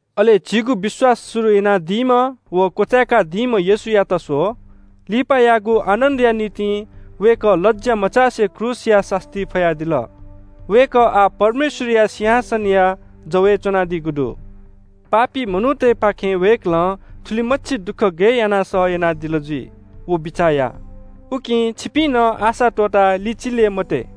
अले झीगु विश्‍वास शुरु यानादीम्‍ह व क्‍वचाय्‌कादीम्‍ह येशूयात स्‍व, लिपायागु आनन्‍दया निंतिं वय्‌कः लज्‍या मचासे क्रूसया सास्‍ती फयादिल। वय्‌कः आः परमेश्‍वरया सिंहासनया जवय् च्‍वनादीगु दु। पापी मनूतय्‌पाखें वय्‌कलं थुलिमछि दुःख गये यानाः सह यानादिल जुइ, व बिचाः या। उकिं छिपिं नं आशा त्‍वःताः लिचिले मते।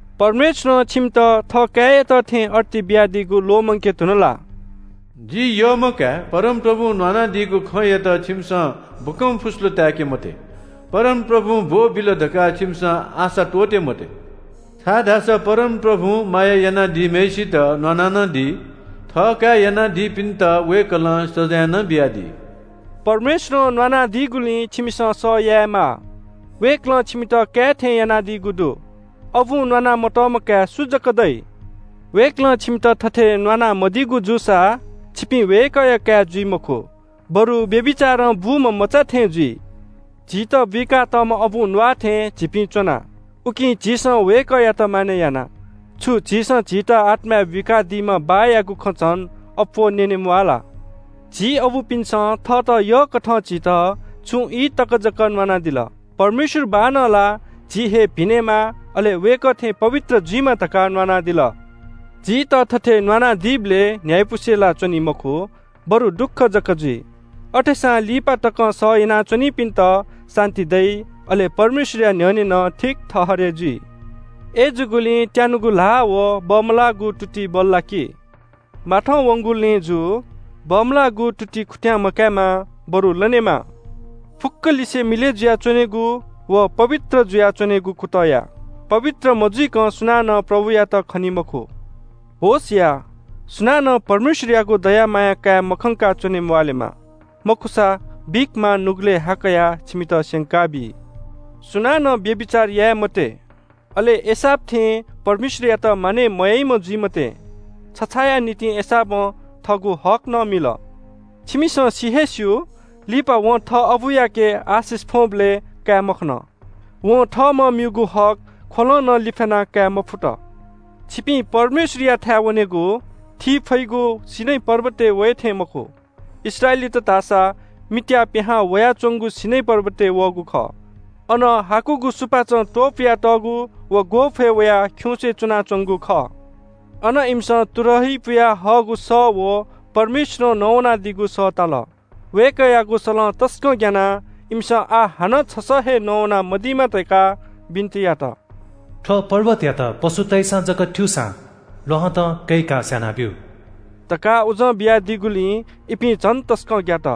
परमेश्‍वरं छिमित थःकाय्‌यात थें अर्ती बियादीगु ल्‍वःमंके धुन ला? “जि यःम्‍ह काय्, परमप्रभुं न्‍वानादीगु खँयात छिमिसं बकंफुस्‍लु ताय्‌के मते। परमप्रभुं ब्‍वःबिल धकाः छिमिसं आशा त्‍वःते मते, छाय्‌धाःसा परमप्रभुं माया यानादीम्‍हय्‌सित न्‍वाना नं दी। थःकाय् यानादीपिन्‍त वय्‌कलं सजाँय नं बियादी।” परमेश्‍वरं न्‍वानादीगुलिं छिमिसं सह यायेमाः। वय्‌कलं छिमित काय् थें यानादीगु दु। अबुं न्‍वाना मतःम्‍ह काय् सु जक दइ? वय्‌कलं छिमित थथे न्‍वाना मदीगु जूसा छिपिं वय्‌कःया काय् जुइ मखु, बरु व्‍यभिचारं बूम्‍ह मचा थें जुइ। झीत बुइका तःम्‍ह अबुं न्‍वाःथें झीपिं च्‍वना, उकिं झीसं वय्‌कःयात मानय् याना। छु झीसं झीत आत्‍माय् बुइकादीम्‍ह बाःयागु खँ झन अप्‍वः न्‍यने म्‍वाः ला? झी अबुपिन्‍सं थःत यःकथं झीत छुं ई तक जक न्‍वानादिल। परमेश्‍वर बाःनं ला झी हे भिनेमा, अले वय्‌कः थें पवित्र जुइमा धकाः न्‍वानादिल। झीत थथे न्‍वानादीबलय् न्‍ह्याइपुसे ला च्‍वनी मखु, बरु दुःख जक जुइ। अथेसां लिपा तकं सह यानाच्‍वनीपिन्‍त शान्‍ति दइ, अले परमेश्‍वरया न्‍ह्यःने नं ठीक ठहरय् जुइ। अय्‌जूगुलिं त्‍यानुगु ल्‍हाः व बमलाःगु तुति बल्‍लाकि। माथंवंगु लँय् जु। बमलाःगु तुति खुत्‍यां मकायेमा, बरु लनेमा। फुक्‍कलिसे मिलय् जुयाच्‍वनेगु व पवित्र जुयाच्‍वनेगु कुतः या। पवित्र मजुइकं सुनानं प्रभुयात खनी मखु। होश या, सुनानं परमेश्‍वरयागु दया माया काये मखंकाः च्‍वने म्‍वाःलेमा। मखुसा, बिख मां नुगलय् हा कयाः छिमित स्‍यंकाबी। सुनानं व्‍यभिचार याये मते। अले एसाव थें परमेश्‍वरयात मानय् मयाइम्‍ह जुइ मते। छछाःया निंतिं एसावं थःगु हक नं मिल। छिमिसं सि हे स्‍यू, लिपा वं थः अबुयाके आशिष फ्‍वंबलय् काये मखन। वं थःम्‍हं म्‍यूगु हक ख्‍वलं नं लिफ्‍याना काये मफुत। छिपिं परमेश्‍वरयाथाय् वनेगु थी फइगु सीनै पर्वतय् वये थें मखु। इस्राएलीत धाःसा मित्‍याः पिहां वयाच्‍वंगु सीनै पर्वतय् वःगु खः। अन हाकुगु सुपाचं त्‍वपुयातःगु व ग्‍वःफय् वयाः खिउँसे च्‍वनाच्‍वंगु खः। अन इमिसं तुरही पुयाहःगु सः व परमेश्‍वरं नवानादीगु सः ताल। वय्‌कःयागु सलं तसकं ग्‍यानाः इमिसं आः हानं छसः हे नवाना मदीमा धकाः बिन्‍ति यात। “थ्‍व पर्वतयात पशुतय्‌सं जक थ्‍यूसां ल्‍वहँतं कय्‌काः स्‍यानाब्‍यु” धकाः उजं बियादीगुलिं इपिं झन तसकं ग्‍यात।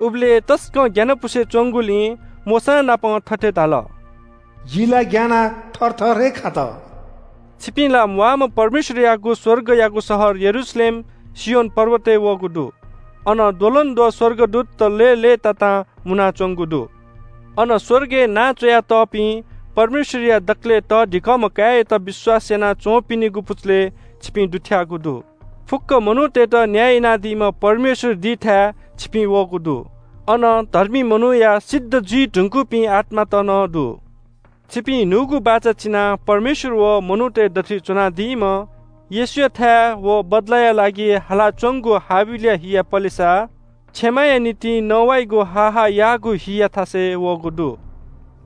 उबलय् तसकं ग्‍यानापुसे च्‍वंगुलिं मोशांनापं थथे धाल – “जि ला ग्‍यानाः थरथर हे खात।” छिपिं ला म्‍वाःम्‍ह परमेश्‍वरयागु स्‍वर्गयागु शहर यरूशलेम, सियोन पर्वतय् वःगु दु। अन द्वलंद्वः स्‍वर्गदूतत लय्‌लय्‌तातां मुनाच्‍वंगु दु। अन स्‍वर्गय् नां च्‍वयातःपिं, परमेश्‍वरया दकलय् तःधिकःम्‍ह काय्‌यात विश्‍वास याना च्‍वंपिनिगु पुचलय् छिपिं दुथ्‍याःगु दु। फुक्‍क मनूतय्‌त न्‍याय यानादीम्‍ह परमेश्‍वर दीथाय् छिपिं वःगु दु। अन धर्मी मनूया सिद्ध जुइ धुंकूपिं आत्‍मात नं दु। छिपिं न्‍हूगु बाचा चिनाः परमेश्‍वर व मनूतय् दथुइ च्‍वनादीम्‍ह येशूयाथाय् व बदलाया लागि हालाच्‍वंगु हाबिलया हिया पलेसा क्षमा या निंतिं नवाइगु हाः हाः याःगु हिया थासय् वःगु दु।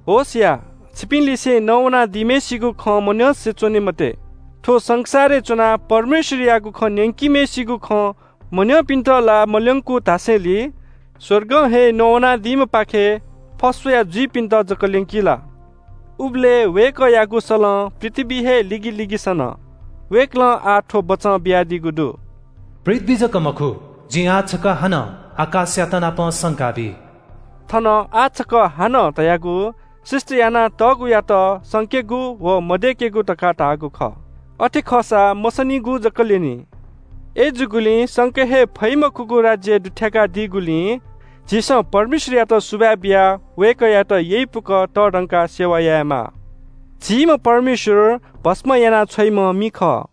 होश या, छिपिंलिसे नवानादीम्‍हय्‌सिगु खँ मन्‍यंसे च्‍वने मते। थ्‍व संसारय् च्‍वनाः परमेश्‍वरयागु खँ न्‍यंकीम्‍हय्‌सिगु खँ मन्‍यंपिन्‍त ला मल्‍यंकू धासेंलि स्‍वर्गं हे नवानादीम्‍हपाखे फस्‍वया जुइपिन्‍त जक ल्‍यंकी ला? उबलय् वय्‌कःयागु सलं पृथ्‍वी हे लिगिलिगि सन। वय्‌कलं आः थ्‍व बचं बियादीगु दु – “पृथ्‍वी जक मखु, जिं आः छकः हानं आकाशयातनापं संकाबी।” थन “आः छकः हानं” धयागु सृष्‍टि याना तःगुयात संकेगु व मदय्‌केगु धकाः धाःगु खः। अथे खःसा मसनिगु जक ल्‍यनी। अय्‌जूगुलिं संके हे फइ मखुगु राज्‍यय् दुथ्‍याकादीगुलिं झीसं परमेश्‍वरयात सुभाय् बियाः वय्‌कःयात यइपुक तःधंकाः सेवा यायेमाः। झीम्‍ह परमेश्‍वर भस्‍म याना छ्वइम्‍ह मि खः।